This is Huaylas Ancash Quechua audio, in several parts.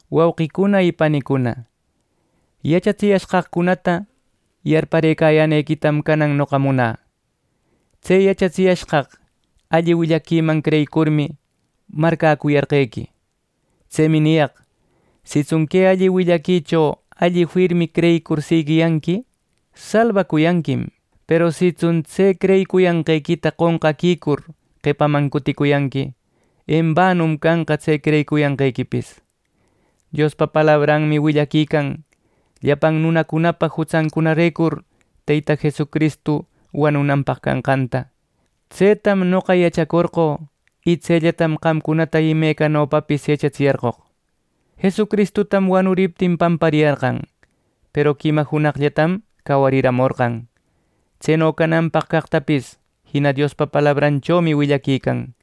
Wauqicuna y panicuna, yachatsiyashqaqcunata yarparëcayänequitam canan noqa munä. Tse yachatsiyashqaq alli willaquiman creyicurmi marcäcuyarqequi. Tsemi niyaq: Sitsun que alli willaquicho alli firmi creyicur siguiyanqui salbacuyanquim, peru sitsun tse creyicuyanqequita qonqaquicur qepaman cuticuyanqui, embanum canqa tse creyicuyanqequipis. Diospa palabranmi willaquican llapan nunacunapa jutsancunarecur Teyta Jesucristu wanunanpaq canqanta. Tsetam noqa yachacorqö y tsellatam qamcunata imecanopapis yachatsiyarqoq. Jesucristutam wanuriptin pampariyarqan, peru quima junaqllatam cawariramorqan. Tseno cananpaq caqtapis jina Diospa palabranchomi willaquican.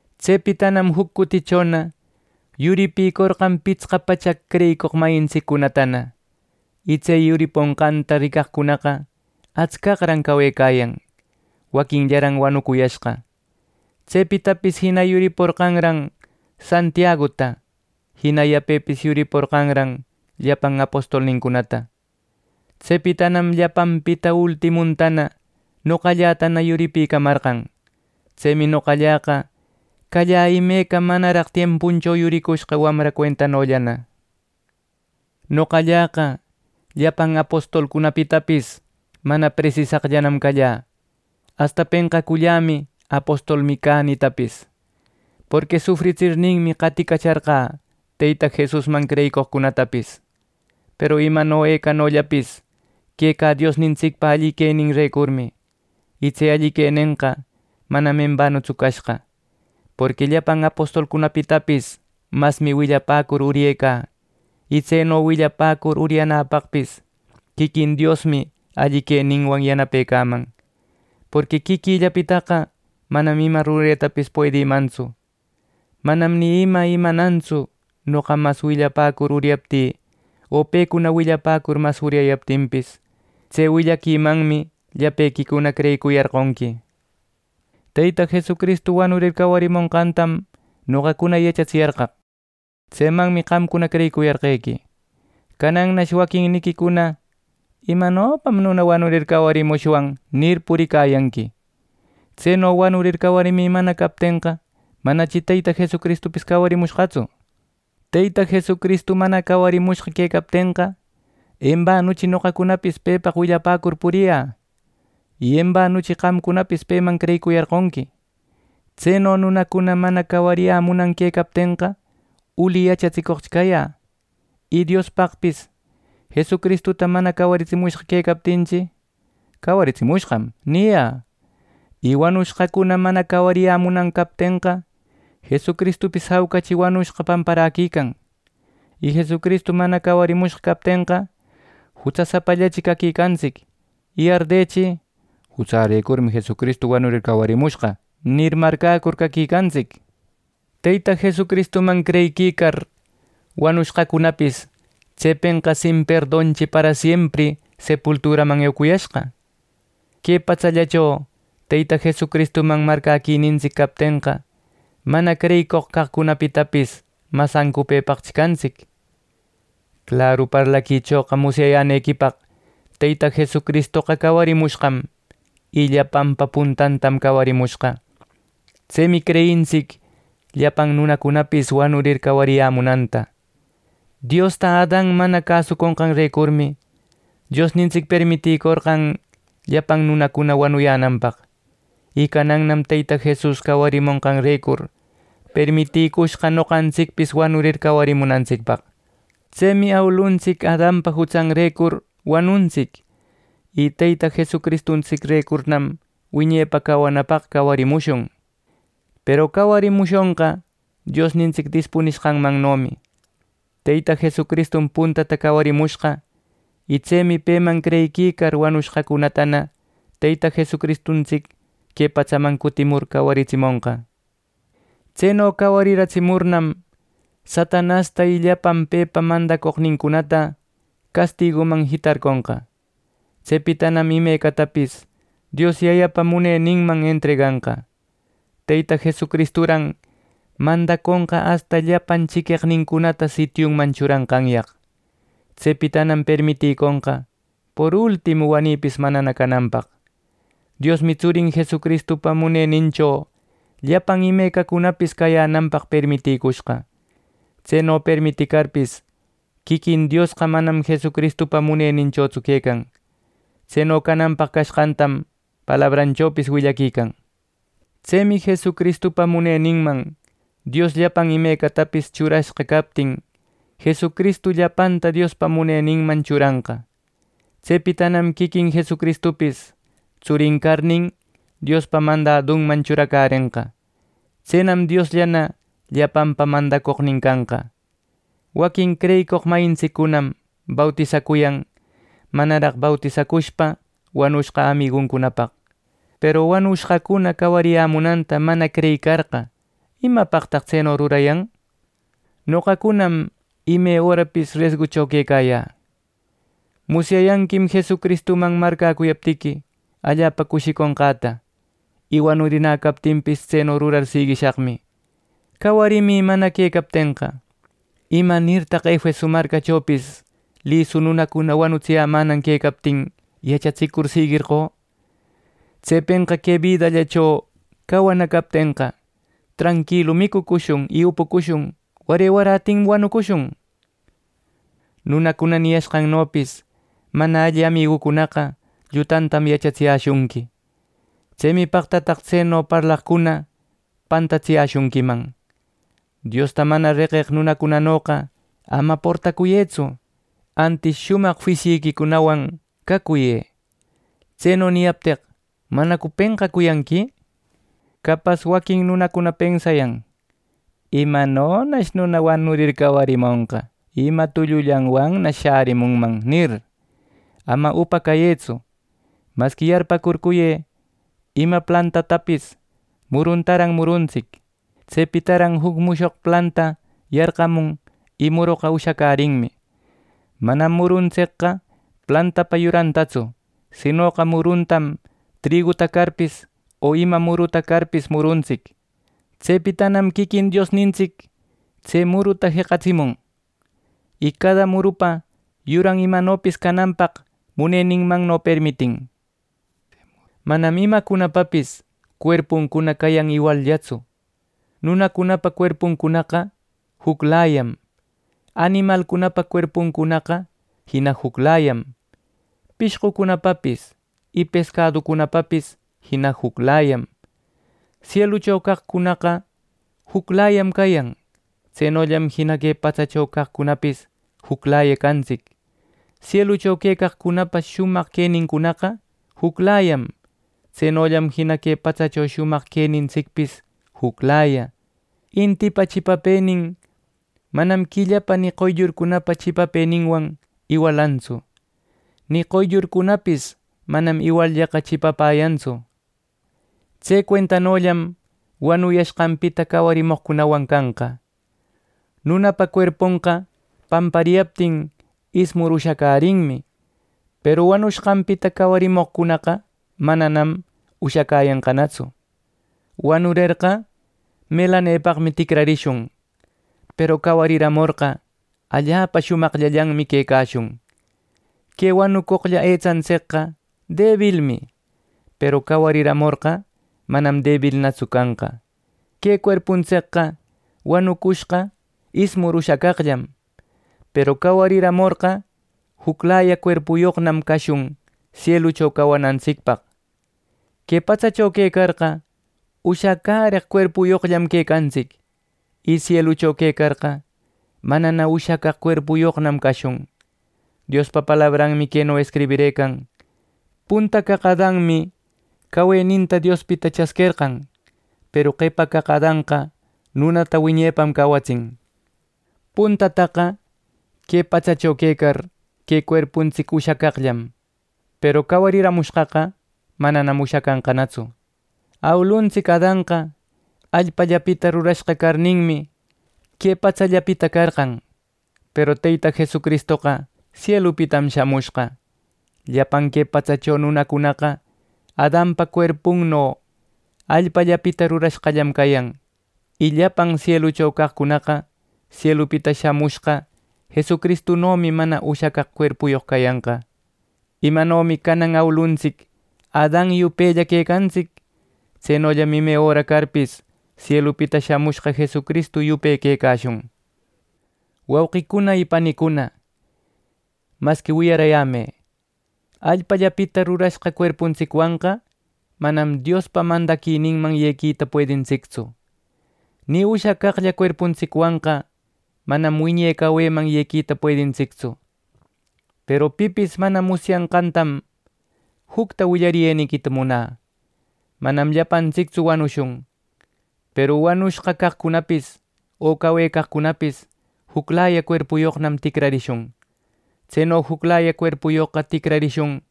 Tsepitanam juc cutichona yuripïcorqan pitsqa pachaq creyicoq mayintsiccunatana, y tse yuriponqanta ricaqcuna atscaqran cawecayan; waquinllaran wanuyashqa. Tsepitapis jina yuriporqanran Santiaguta; jina yapepis yuriporqanran llapan apostolnincunata. Tsepitanam llapanpita ultimuntana noqallätana yuripicamarqan. Tsemi noqalläqa callä imeca manaraq tiempuncho yuricushqa wamra cuentanollana. Noqalläqa llapan apostolcunapitapis mana presisaqllam callä. Asta penqacullämi “Apostolmi cä” nitapis. Porqui sufritsirninmi, qaticacharqä Teyta Jesusman creyicoqcunatapis. Peru imano ecanollapis quecä Diosnintsicpa alli queninrecurmi. Y tse alli quenenqa manam embanutsu cashqa. Porqui llapan apostolcunapitapis masmi willapäcur uryecä, y tseno willapäcur uryanäpaqpis quiquin Diosmi alli queninwan yanapecaman, porqui quiquïllapitaqa manam ima ruretapis puedïmantsu. Manam ni ima imanantsu noqa mas willapäcur uryaptï o pecuna willapäcur mas uryayaptinpis. Tse willaquimanmi llapequicuna creyicuyarqonqui. Teyta Jesucristu wanurir cawarimonqantam noqacuna yachatsiyarqaq; tsemanmi qamcuna creyicuyarqequi. Canannash waquinniquicuna “¿Imanopam nuna wanurir cawarimushwan!” nir, puriquicayanqui. Tseno wanurir cawarimi mana captenqa manachi Teyta Jesucristupis cawarimushqatsu. Teyta Jesucristu mana cawarimushqa quecaptenqa, embanuchi noqacunapis pepaq willapäcur puriyä y embanuchi qamcunapis peman creyicuyarqonqui. Tseno nunacuna mana cawariyämunan quecaptenqa, uli yachatsicoqchi cayä. Y Diospaqpis Jesucristuta mana cawaratsimushqa quecaptinchi, “cawaratsimushqam” niyä. Y wanushqacuna mana cawariyämunan captenqa Jesucristupis jaucachi wanushqa pamparäquican. Y Jesucristu mana cawarimushqa captenqa jutsasapallachi caquicantsic y ardechi “Jutsärecurmi Jesucristu wanurir cawarimushqa” nir, marcäcur caquicantsic. Teyta Jesucristuman creyiquicar wanushqacunapis, tsepenqa sin perdonchi parasiempri sepulturaman eucuyashqa. Que patsallacho Teyta Jesucristuman marcäquinintsic captenqa, mana creyicoq caqcunapitapis mas ancupëpaqchi cantsic. Claru parlaquichoqa musyayänequipaq Teyta Jesucristoqa cawarimushqam, y llapanpa puntantam cawarimushqa. Tsemi creyintsic llapan nunacunapis wanurir cawariyämunanta. Diosta Adan mana cäsonqanrecurmi Diosnintsic permitïcorqan llapan nunacuna wanuyänanpaq. Y canannam Teyta Jesucristu cawarimonqanrecur permitïcushqa noqantsicpis wanurir cawarimunapaq. Tsemi awiluntsic Adanpa jutsanrecur wanuntsic, y Teyta Jesucristurecurnam wiñepa cawanapaq cawarimushun. Peru cawarimushonqa Diosnintsic dispunishqanmannomi: Teyta Jesucristum puntata cawarimushqa, y tsemi peman creyiquicar wanushqacunatana Teyta Jesucristuntsic que patsaman cutimur cawaritsimonqa. Tseno cawariratsimurnam, Satanasta y llapan pepa mandacoqnincunata castiguman jitarconqa. Tsepitanam imecatapis Dios Yayapa muneninman entreganqa. Teyta Jesucristuran mandaconqa asta llapan chiqueqnincunata sitiunman churanqanyaq. Tsepitanam permitïconqa por ultimu wanïpis manana cananpaq. Diosmi tsurin Jesucristupa munenincho llapan imecacunapis cayänanpaq permitïcushqa. Tseno permiticarpis, quiquin Diosqa manam Jesucristupa muneninchotsu quecan. Tseno cananpaq cashqantam palabranchopis willaquican. Tsemi Jesucristupa muneninman Dios llapan imecatapis churashqa captin, Jesucristu llapanta Diospa muneninman churanqa. Tsepitanam quiquin Jesucristupis tsurin carnin, Diospa mandadunman churacärenqa. Tsenam Diosllana llapanpa mandacoqnin canqa. Waquin creyicoq mayintsiccunam bautisacuyan manaraq bautisacushpa wanushqa amiguncunapaq, peru wanushqacuna cawariyämunanta mana creyicarqa, ¿imapaqtaq tseno rurayan! Noqacunam ime örapis resgucho quecayä. Musyayanquim Jesucristuman marcäcuyaptiqui, allapa cushicunqäta. Y wanurinä captinpis, tseno rurar siguishaqmi. Cawarimi mana quecaptenqa, ¿imanirtaq Efeso marcachopis lisu nunacuna wanutsiyämänan quecaptin, yachatsicur siguerqö? ¡Tsepenqa que bidallacho cawana captenqa, “Tranquilu micucushun y upucushun, ware warätinmi wanucushun!” Nunacuna niyashqannopis “Mana alli amigucunaqa, llutantam yachatsishunqui.” Tsemi paqtataq tseno parlaqcuna pantatsiyäshunquiman. Diosta mana reqeq nunacunanoqa ama portacuyëtsu, antis shumaq juisyiquicunawan cacuyë. Tseno niyapteq ¿manacu penqacuyanqui? Capas waquin nunacuna pensayan: ¿imanonash nuna wanurir, cawarimonqa, y ima tullullanwannash shärimunman? —nir. Ama upa cayëtsu; masqui yarpäcurcuyë. Ima plantapatapis muruntaran muruntsic. Tsepitaran juc mushoq planta yarqamun y muroqa ushacärinmi. Manam muruntsicqa plantapa yurantatsu, sinoqa murutaran triguta carpis, o ima muruta carpis muruntsic. Tsepitanam quiquin Diosnintsic tse muruta jeqatsimun, y cada murupa yuran imanopis cananpaq muneninmanno permitin. Manam imacunapapis cuerpuncuna cayan iwalllatsu. Nunacunapa cuerpuncunaqa juclayam. Animalcunapa cuerpuncunaqa jina juclayam. Pishqucunapapis y pescaducunapapis jina juclayam. Sielucho caqcunaqa juclayam cayan. Tsenollan jina que patsacho caqcunapis juclaya cantsic. Sielucho quecaqcunapa shumaq quenincunaqa juclayam. Tsenollam jina que patsacho shumaq quenintsicpis juclaya. Intipa chipapënin manam quillapa ni qoyllurcunapa chipapëninwan iwalantsu, ni qoyllurcunapis manam iwalllaqa chipapäyantsu. Tse cuentanollam wanuyashqanpita cawarimoqcunawan canqa: Nunapa cuerponqa pampariyaptin, ismur ushacärinmi; peru wanushqanpita cawarimoqcunaqa mananam ushacäyanqanatsu. Wanurerqa melanepaqmi ticrarishun, peru cawariramorqa allapa shumaqllallanmi quecashun. Que wanucoqlla etsantsicqa debilmi, peru cawariramorqa manam debilnatsu canqa. Que cuerpuntsicqa wanucushqa ismur ushacaqllam. Peru cawariramorqa juclaya cuerpuyoqnam cashun sielucho cawanantsicpaq. Que patsacho quecarqa, ushacäreq cuerpuyoqllam quecantsic; y sielucho quecarqa, manana ushacaq cuerpuyoqnam cashun. Diospa palabranmi queno escribirëcan: “Punta caq Adanmi caweninta Diospita chasquerqan”; peru qepa caq Adanqa nunata wiñepam cawatsin. Puntataqa que patsacho quecar, que cuerpuntsic ushacaqllam. Peru cawariramushqaqa, manam ushacanqanatsu. Awiluntsic Adanqa allpallapita rurashqa carninmi, que patsallapita carqan; peru Teyta Jesucristoqa sielupitam shamushqa. Llapan que patsacho nunacunaqa Adanpa cuerpunno allpapita rurashqallam cayan; y llapan sielucho caqcunaqa sielupita shamushqa Jesucristunomi mana ushacaq cuerpuyoq cayanqa. Imanomi canan awiluntsic Adan yupella quecantsic; tsenollam ime öra carpis, sielupita shamushqa Jesucristu yupe quecashun. Wauqicuna y panicuna, masqui wiyaräyämë: Allpapita rurashqa cuerpuntsicwanqa manam Diospa mandaquininman yequita puedintsictsu, ni ushacaqlla cuerpuntsicwanqa manam wiñe caweman yequita puedintsictsu. Peru pipis mana musyayanqantam jucta willariyeniquita munä: Manam llapantsictsu wanushun, peru wanushqa caqcunapis o cawecaqcunapis, juclaya cuerpuyoqnam ticrarishun. Tseno juclaya cuerpuyoqqa ticrarishun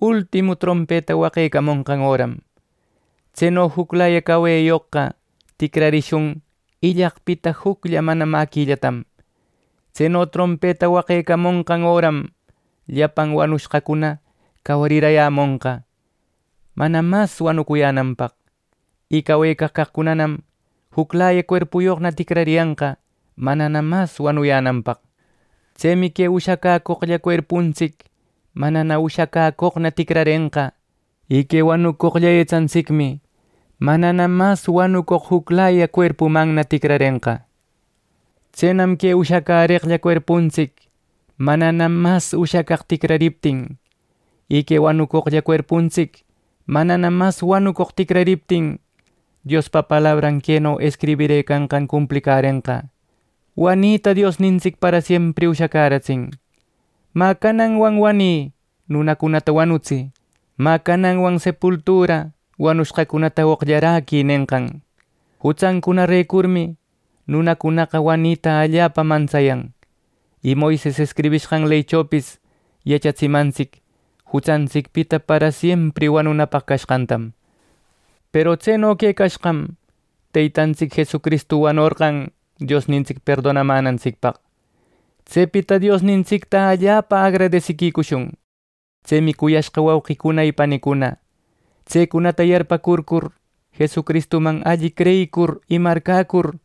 ultimu trompeta waqecamonqan öram. Tseno juclaya caweyoqqa ticrarishun illaqpita juclla mana mäquillatam. Tseno trompeta waqecamonqan öram llapan wanushqacuna cawarirayämonqa, manana mas wanuyänanpaq, y cawecaq caqcunanam juclaya cuerpuyoqna ticrariyanqa, manana mas wanuyänanpaq. Tsemi que ushacäcoqlla cuerpuntsic manana ushacäcoqna ticrarenqa, y que wanucoqlla etsantsicmi manana mas wanucoq juclaya cuerpumanna ticrarenqa. Tsenam que ushacäreqlla cuerpuntsic manana mas ushacaq ticrariptin, y que wanucoqlla cuerpuntsic manana mas wanucoq ticrariptin, Diospa palabran queno escribirëcanqan cumplicärenqa: “Wanita Diosnintsic parasiempri ushacäratsin” “¡Mä cananwan wanï, nunacunata wanutsï! ¡Mä cananwan sepultura wanushqacunata oqllaräquï!” nenqan. Jutsancunarecurmi nunacunaqa wanita allapa mantsayan. Y Moises escribishqan leychopis yachatsimantsic jutsantsicpita parasiempri wanunapaq cashqantam. Peru tseno quecashqam, Teytantsic Jesucristu wanorqan Diosnintsic perdonamänantsicpaq. ¡Tsepita Diosnintsicta allapa agradesiquicushun! Tsemi, cuyashqa wauqicuna y panicuna, tsecunata yarpäcurcur, Jesucristuman alli creyicur y marcäcur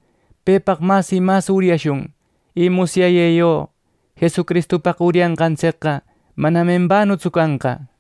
pepaq mas y mas uryashun, y musyayë ¡yo Jesucristupaq uryanqantsicqa manam embanutsu canqa!